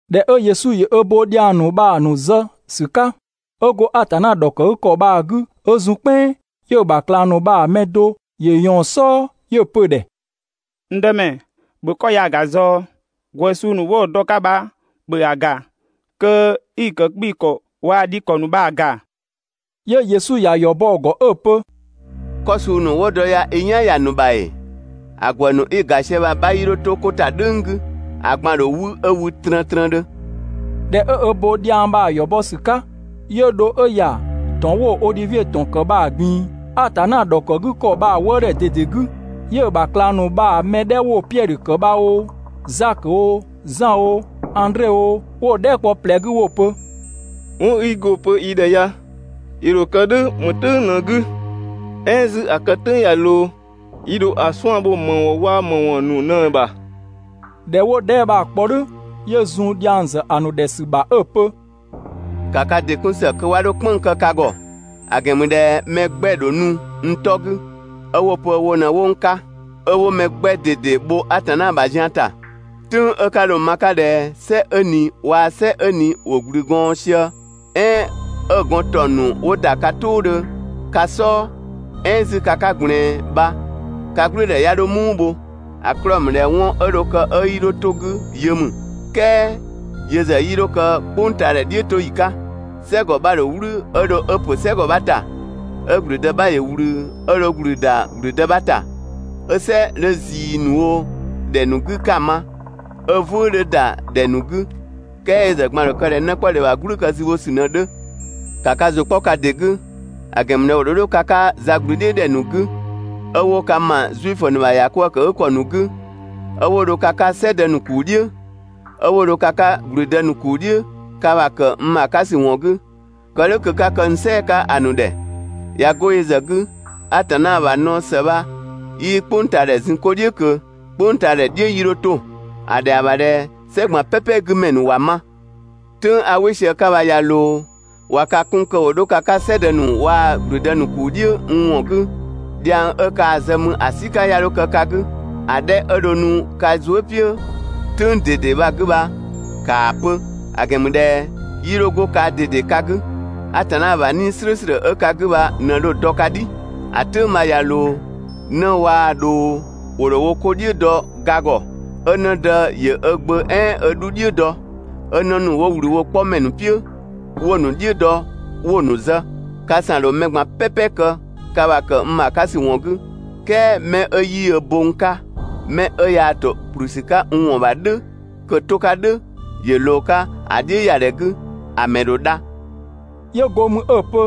꞊Dhɛ 'ö Yesu ‑yö ö bo dhiang ‑nu bha‑ ‑nu zë ‑sü 'ka, 'ö go Atanna ‑dhɔkëgükɔ bha‑ 'gü 'ö zun "kpɛnng, 'yö‑ ‑bha ꞊klang ‑nu bha‑ mɛ do ‑yö ꞊yɔɔn‑ "sɔɔ 'yö‑ pö‑ ‑dhɛ: «N Dëmɛ, ‑bhö 'kɔ ya‑ ‑ga ꞊zɔɔ, ‑gwë suu ‑nu 'wo‑ dɔ‑ 'ka bha ‑bhö ‑a ‑ga kö 'i‑ ‑kë 'kpii‑ ‑kɔ waa‑ dhi ‑kɔ ‑nu bha‑ ‑ga.» 'Yö Yesu ‑ya ‑yɔ bɔ‑ ‑gɔ 'ö‑ pö: «'Kɔ suu ‑nu 'wo dɔ bha i "yan ‑ya ‑nu ‑bha ‑ee? ‑A ‑gwë ‑nu 'i‑ ‑ga sië bha‑ 'bha 'yii 'dho 'to 'ko ‑ta "dhʋ̈ng 'gü, ‑a ꞊gban ‑dho 'wü 'ö wü trëntrëndhö.» ꞊Dhɛ 'ö ö bo dhiang bha‑ ‑yɔ bɔ ‑sü 'ka, 'yö dho 'ö ‑ya ‑tɔn 'wo Odhivie ‑tɔn ‑kë bha‑ ꞊gbin‑, Atanna ‑dhɔkëgükɔ bha‑ wëëdhɛ ꞊dede 'gü. 'Yö‑ ‑bha ꞊klang ‑nu bha‑ mɛ 'dhɛ 'wo‑ Piɛdhö ‑kë bha oo, Zakö oo, Zan oo, Andre oo, 'wo‑ dhɛɛ" kpɔ ꞊plɛ 'gü 'wo‑ pö: «'Wɔn 'i go‑ pö yi ‑dhɛ ya, ‑yö ‑dho kë "dhʋ̈ ‑më "tʋ̈ng 'gü? "Ɛɛn 'zü ‑a kë "tʋ̈ng ꞊ya ꞊loo yi ‑dho ‑a 'suan‑ bho ‑më ‑wɔn waa‑ ‑më ‑wɔn ‑nu ꞊në‑ ‑bha?» ꞊Dhɛ 'wo dhɛɛ" bha‑ kpɔ "dhʋ̈, 'yö zun dhiang ‑zë ‑a ‑nu ‑dhɛ ‑sü ‑bha 'ö‑ pö: «‑Ka ka ‑dɩ 'kun ‑së kö 'wa 'dho "kpënng‑ kë ka ‑gɔ, ‑a ‑gɛn ‑mü ꞊dhɛ mɛ 'gbɛ‑ ‑dho nu n 'tɔ 'gü, 'ö 'wo‑ pö wo ꞊në 'wo n 'ka. 'Ö 'wo mɛ 'gbɛ ꞊dede bho Atanna ‑bha zian ‑ta. "Tʋ̈ng 'ö ka dho‑ ma‑ 'ka ꞊dhɛ "sɛ 'ö ꞊ni waa‑ "sɛ 'ö ꞊ni ‑wo ‑gblü gɔɔn sië, "ɛɛn 'ö‑ gɔn ‑taɔng ‑nu dho ‑da 'ka ka "tʋʋdhö ka "sɔɔ, "ɛɛn 'zü ka 'ka ꞊gblɛɛn bha ka "gblʋ̈ʋ̈dhɛ 'ya 'dho "muu bho, ‑a 'klɔɔ‑ ‑mü ꞊dhɛ 'wɔn 'ö dho kë 'ö 'yii 'dho 'to‑ 'gü yö ‑mü, "kɛɛ yö ‑zë 'yii 'dho kë "kpʋngtaadhɛ "dhiʋ̈toyi 'ka. "Sɛgɔ 'bha‑ ‑dho "wlü 'ö dho 'ö ‑pö "sɛgɔ 'bha ‑ta, 'ö ‑gblüdë 'bha ‑yö ꞊wlü, 'ö dho 'ö ‑gblü ‑da ‑gblüdë bha ‑ta, 'ö "sɛ 'dhö ꞊zii ‑nu wo ‑dhɛ ‑nu 'gü 'ka‑ ma, 'ö "vʋ̈ʋ̈ 'dhö ‑da ‑dhɛ ‑nu 'gü, "kɛɛ yö ‑zë ꞊gban‑ ‑dho kë ꞊dhɛ 'nëkpɔdhe ‑bha "gblü kë zübhosü ꞊në‑ 'dhö. ‑Ka ka ‑zʋ 'kpɔ ka ‑dɩ 'gü, ‑a ‑gɛn ‑mü ꞊dhɛ ‑wo ‑dho 'dho ka 'ka za ꞊gblü "dhiʋ̈ ‑dhɛ ‑nu 'gü, 'ö 'wo ka ‑ma Zuifö ‑nu ‑bha ‑yakwëëkëgükɔ ‑nu 'gü, 'ö 'wo dho ka 'ka "sɛdë ‑nu ‑kuu "dhiʋ̈, 'ö 'wo dho ka 'ka ‑gblüdë ‑nu ‑kuu "dhiʋ̈ ka ‑bha ‑kë n ‑bha 'ka ‑sü ‑wɔn 'gü, kë "dhʋ̈ kö 'ka kë n "sɛɛ‑ 'ka ‑a ‑nu ‑dhɛ. ꞊Ya 'go yö ‑zë 'gü, Atanna ‑bha naɔ ‑së bha 'yii "kpʋngtaadhɛ zun 'ko "dhiʋ̈ ꞊kö, "kpʋngtaadhɛ "dhiʋ̈ 'yii 'dho 'to. ‑A ‑dhɛa ‑bha ꞊dhɛ "sɛ ꞊gban "pɛpɛ 'gü ‑mɛ ‑nu ‑wa ma. "Tʋ̈ng 'a "wɩ sië 'ka bha ꞊ya ꞊loo, ꞊wa ka 'kun kö ‑wo 'dho ka 'ka "sɛdë ‑nu waa‑ ‑gblüdë ‑nu ‑kuu "dhiʋ̈ n ‑wɔn 'gü, dhiang 'ö kaa‑ zë mü ‑a "sika 'ya 'dho kë ka 'gü, ‑a 'dhɛ 'ö dho nu ka zuë" "piʋ̈‑ "tʋ̈ng ꞊dede bha‑ 'gü bha ‑kaa pö, ‑a ‑gɛn ‑mü ꞊dhɛ 'yii 'dho 'go kaa ꞊dede ka 'gü, Atanna ‑bha 'Nii‑ "slʋ̈ʋ̈slʋ̈ 'ö ka 'gü bha ꞊në dho‑ dɔ ka "dhi. ‑A "tʋ̈ng bha ꞊ya ꞊loo, 'në waa‑ ꞊dhoo ‑wo ‑dho wo 'ko "dhiʋ̈ dɔ ga ‑gɔ, 'ö 'në dë ‑yö ö gbö "ɛɛn ö 'dhu "dhiʋ̈ dɔ, 'ö 'në ‑nu ‑wo ꞊wlü wo 'kpɔmɛ ‑nu "piʋ̈ 'wo‑ ‑nu "dhiʋ̈ dɔ 'wo‑ ‑nu zë. Ka ‑san ‑dho mɛ ꞊gban "pɛpɛ kë ka ‑bha ‑kë n ‑bha 'ka ‑sü ‑wɔn 'gü, "kɛɛ 'mɛ 'ö 'yii ö bo n 'ka, 'mɛ 'ö yaa ‑to ‑kplü ‑sü 'ka n ‑wɔn ‑bha "dhʋ̈ kö‑ 'to‑ 'ka "dhʋ̈ ‑yö ꞊loo‑ 'ka ‑a "dhiʋ̈yadhɛ 'gü, ‑a ‑mɛ ‑dho dha.» 'Yö go mü 'ö‑ pö: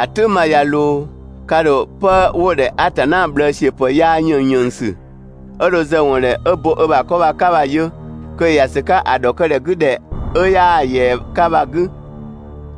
«‑A "tʋ̈ng bha ꞊ya ꞊loo, ka ‑dho 'pë 'wo‑ ‑dhɛ Atanna ꞊bhlëësiöpë 'yaa ‑yënngyënngsü, 'ö dho zë‑ ‑wɔn ‑dhɛ 'ö bo ö ‑bha 'kɔ 'ka bha‑ yö kö ‑yö ‑ya ‑sü 'ka ‑a ‑dhɔkëgükɔ 'gü ‑dhɛ 'ö 'yaa‑ ‑yɛa 'ka bha‑ 'gü.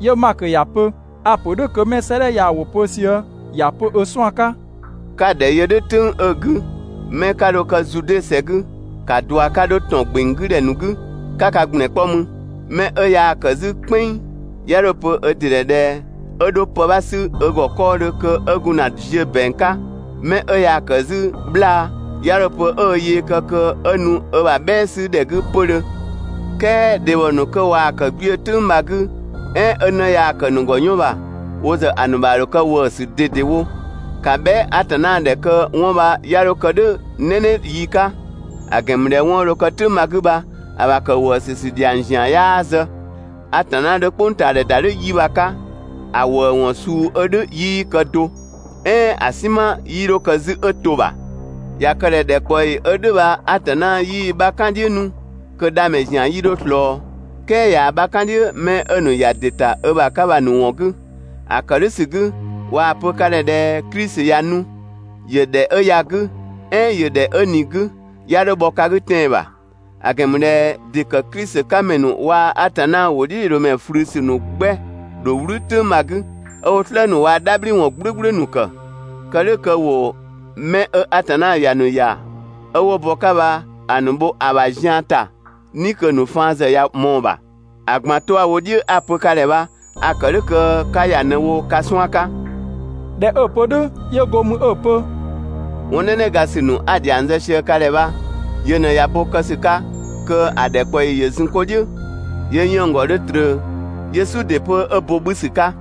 ('Yö Makö ‑ya pö: «A‑ ‑pö "dhʋ̈ kö 'mɛ 'ö 'sëëdhɛ ya‑ ‑wʋ pö sië ‑ya pö ö 'suan‑ 'ka.») 'Ka‑ ‑dhɛ yö "dhʋ̈ "tʋ̈ng 'ö‑ 'gü, 'mɛ 'ka dho kë Zude ‑sɛ 'gü, ‑ka ꞊dua 'ka 'dho ‑tɔn ‑gbeng 'gü ‑dhɛ ‑nu 'gü 'ka ka ‑gblɛn 'kpɔ mü. 'Mɛ 'ö yaa‑ ‑kë 'zü "kpɛnng, 'ya 'dho‑ pö ö ‑dɩ ‑dhɛ ꞊dhɛ 'ö 'dho pë 'bha 'sü ö ‑gɔ 'kɔɔdhö kö 'ö gun ‑na ziö ‑bɛang 'ka. 'Mɛ 'ö yaa‑ ‑kë 'zü 'bhlaa‑, 'ya 'dho‑ pö 'ö ö yee kë kö 'ö nu ö ‑bha "bhɛɛ 'sü ‑dhɛ 'gü 'pödhö, "kɛɛ dhebhɔ ‑nu 'kö waa‑ ‑kë 'gbiö‑ "tʋ̈ng bha‑ 'gü, "ɛɛn 'ö 'në yaa‑ ‑kë ‑nu ‑gɔ 'yɔn ‑bha, wo ‑zë ‑a ‑nu ‑bha ‑dho kë ‑wëësü ꞊dedewo! ‑Ka bhɛa" Atanna ‑dhɛ kö 'wɔn bha 'ya 'dho kë "dhʋ̈ "nɛnɛ yi 'ka, ‑a ‑gɛn ‑mü ꞊dhɛ 'wɔn 'ö dho kë "tʋ̈ng bha‑ 'gü bha, ‑a ‑bha ‑kë ‑wëësü ‑sü ‑dhiang ‑zian 'yaa zë. Atanna 'dhö "kpʋngtaadhɛ ‑da "dhʋ̈ yi bha‑ 'ka, ‑a ‑wëëwɔn suu 'ö "dhʋ̈ 'yii kë do, "ɛɛn ‑a "sinma 'yii 'dho kë 'zü 'ö to‑ ‑bha. ꞊Ya kë ꞊dhɛ ‑dhɛkpaɔyi 'ö "dhʋ̈ bha Atanna 'yii‑ 'bha "kan‑ "dhiʋ̈ 'nu, kö dhamɛ ‑zian 'yii 'dho ꞊slɔɔ, "kɛɛ ꞊yaa‑ 'bha "kan‑ "dhiʋ̈ 'mɛ 'ö‑ ‑nu ‑ya ‑dɩ ‑ta ö ‑bha 'ka bha‑ ‑nu ‑wɔn 'gü. ‑A ‑kë "dhʋ̈ ‑sü 'gü, ꞊waa‑ pö ka ‑dhɛ ꞊dhɛ Klisi ꞊ya nu, ‑yö ‑dhɛ 'ö ya‑ 'gü, "ɛɛn ‑yö ‑dhɛ 'ö ꞊ni‑ 'gü, 'ya 'dho bhɔ ka 'gü tɛan‑ ‑bha. ‑A ‑gɛn ‑mü ꞊dhɛ ‑dɩ ‑kë Klisi 'ka ‑mɛ ‑nu waa‑ Atanna ‑wʋdhiʋ̈loomɛ ꞊flü ‑sü ‑nu 'gbɛ‑ ‑dho "wlü "tʋ̈ng bha‑ 'gü, 'ö 'wo "slë ‑nu waa‑ "dhabhliwɔn "gblʋ̈gblʋ̈ ‑nu ‑kë, kë "dhʋ̈ kö ‑wo 'mɛ 'ö Atanna ‑ya ‑nu ‑ya 'ö 'wo bɔ‑ 'ka bha‑ ‑nu bho‑ ‑bha zian ‑ta "ni kö‑ ‑nu faan ‑zë ꞊ya ꞊mɔɔ‑ ‑bha. ‑A ꞊gban 'to 'a‑ wo "dhiʋ̈ 'a‑ pö ka ‑dhɛ bha a‑ ‑kë "dhʋ̈ kö 'ka ‑ya ꞊në‑ wo ka 'suan‑ 'ka.» ꞊Dhɛ 'ö‑ pö "dhʋ̈, 'yö go mü 'ö‑ pö: «'Wɔn "nɛnɛgasü 'a‑ ‑dhiang zë ka ‑dhɛ bha yö ꞊në ꞊ya bo kë ‑sü 'ka kö ‑a ‑dhɛkpaɔyi ‑yö zun 'ko "dhiʋ̈, 'yö 'yënng‑ ‑gɔ 'dho ꞊tröö, 'yö "su ‑dɩ 'pö 'ö bo 'bhü ‑sü 'ka.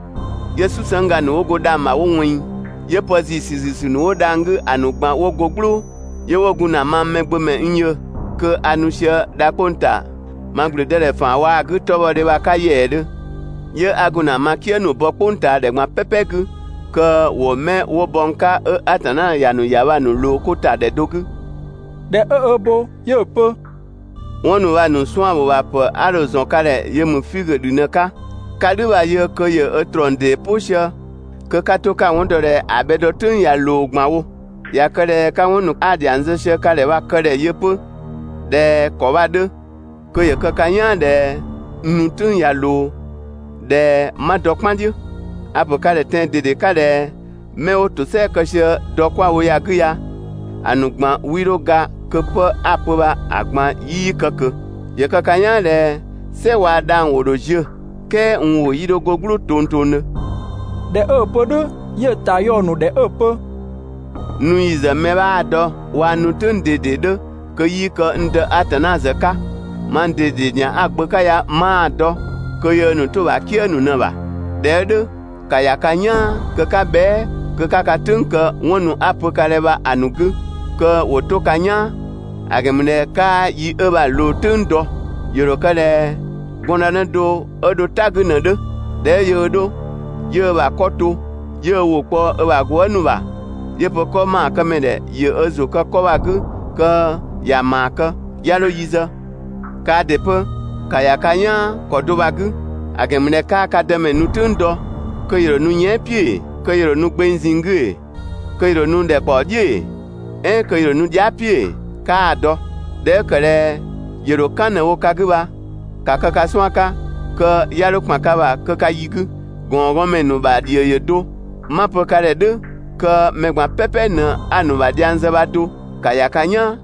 'Yö "susëngga ‑nu 'wo go dhang‑ ‑bha 'wo ꞊wɛnng, 'yö pë ‑ziisü ‑ziisü ‑nu 'wo dhang‑ 'gü ‑a ‑nu ꞊gban 'wo go "glʋʋ. 'Yö 'wo gun ‑na mang Mɛgbömɛ n yö kö a nu sië dha 'kpong‑ ‑ta ma ‑gblüdëdhɛ ‑faan waa‑ 'gü 'tɔbhɔdhe bha‑ 'ka ‑yɛɛdhö. 'Yö 'a gun ‑na ma "kië ‑nu bɔ "kpʋngtaadhɛ ꞊gban "pɛpɛ 'gü kö ‑wo 'mɛ 'wo bɔ n 'ka 'ö Atanna ‑ya ‑nu ‑ya bha‑ ‑nu ꞊loo 'ko ‑ta ‑dhɛ do 'gü. ꞊Dhɛ 'ö ö bo, 'yö‑ pö 'wɔn ‑nu bha‑ ‑nu 'suan‑ ‑bho ‑bha ‑pë 'a dho‑ ‑zɔn ka ‑dhɛ yö ‑mü figö ‑dhü ꞊në‑ 'ka, 'ka "dhü bha‑ yö, kö ‑yö ö ‑trɔng ‑dee "pʋ sië kö 'ka 'to 'ka‑ 'wɔn dɔ ꞊dhɛ ‑a bhɛ dɔ "tʋ̈ng ꞊ya ꞊loo ꞊gban wo. ꞊Ya kë ꞊dhɛ 'ka 'wɔn ‑nu 'a‑ ‑dhiang zë ka ‑dhɛ bha‑ kë ‑dhɛ yö 'pö ꞊dhɛ ‑kɔ bha‑ 'dhö, kö ‑yö kë ka "yaan ꞊dhɛ n nu "tʋ̈ng ꞊ya ꞊loo, ꞊dhɛ 'ma dɔ "kpan "dhiʋ̈. A‑ ‑pö ka ‑dhɛ tɛan‑ ꞊dede 'ka ꞊dhɛ 'mɛ 'wo ‑tosɛa kë sië dɔ ‑kɔ ya‑ 'gü ya, ‑a ‑nu ꞊gban 'wii 'dho ga kö 'pë 'a‑ pö bha‑ ꞊gban 'yii kë ꞊kö. ‑Yö kë ka "yaan ꞊dhɛ "sɛ waa‑ dhang‑ ‑wo ‑dho ziö, "kɛɛ n ‑wʋ 'yii 'dho go "gblʋʋ tongtongdhö.» ꞊Dhɛ 'ö‑ pö "dhʋ̈, 'yö‑ ‑ta yɔ‑ ‑nu ‑dhɛ 'ö‑ pö: «N nu ‑yi ‑zë mɛ 'bhaa‑ dɔ waa‑ n nu "tʋ̈ng ꞊dede 'dhö kö 'yii kë n Dë Atanna ‑zë 'ka, mang ꞊dede ‑zian 'a‑ gbö 'ka ya 'maa‑ dɔ kö yöö ‑nu 'to‑ ‑bha "kië ‑nu ꞊në‑ ‑bha. ꞊Dhɛ 'ö "dhʋ̈, ‑ka ‑ya ka "yaan kö 'ka bhɛa" kö 'ka ka "tʋ̈ng kë 'wɔn ‑nu 'a‑ pö ka ‑dhɛ bha‑ ‑nu 'gü kö ‑wo 'to ka "yaan. ‑A ‑gɛn ‑mü ꞊dhɛ 'kaa yi 'ö bha‑ ꞊loo "tʋ̈ng dɔ. ‑Yö ‑dho kë ꞊dhɛ gɔndënë do 'ö dho "ta 'gü ꞊në‑ 'dhö. ꞊Dhɛ 'ö yöö 'dho, 'yö ö ‑bha 'kɔ to, 'yö ö ‑wʋ kpɔ ö ‑bha gwëëzë ‑nu ‑bha, 'yö‑ pö 'kɔ ‑maakëmɛ ‑dhɛ ‑yö ö ‑zʋ kë 'kɔ bha‑ 'gü kö ‑ya ‑maa kë, 'ya 'dho yi zë. Kaa ‑dɩ 'pö, ‑ka ‑ya ka "yaan ‑kɔ do bha‑ 'gü, ‑a ‑gɛn ‑mü ꞊dhɛ 'kaa ka Dëmɛ nu "tʋ̈ng dɔ, kö ‑yö ‑dho nu yɛan" "piʋ̈ ‑ee? Kö ‑yö ‑dho nu gbeng ꞊zinng 'gü ‑ee? Kö ‑yö ‑dho nu ‑dhɛkpaɔ "dhiʋ̈ ‑ee? "Ɛɛn kö ‑yö ‑dho nu dhia" "piʋ̈ ‑ee? Kaa‑ dɔ. ꞊Dhɛ 'ö ‑kë ꞊dhɛ ‑yö ‑dho "kan ꞊në‑ wo ka 'gü bha, ‑ka kë ka 'suan‑ 'ka kö 'ya 'dho ‑kpan ka ‑bha kö ka yi 'gü. (‑Gɔngɔɔnmɛ ‑nu ‑bha ‑dhio ‑yö do), 'ma‑ pö ka ‑dhɛ "dhʋ̈ kö mɛ ꞊gban "pɛpɛ ꞊në 'a‑ ‑nu ‑bha dhiang zë bha do, ‑ka ‑ya ka "yaan!»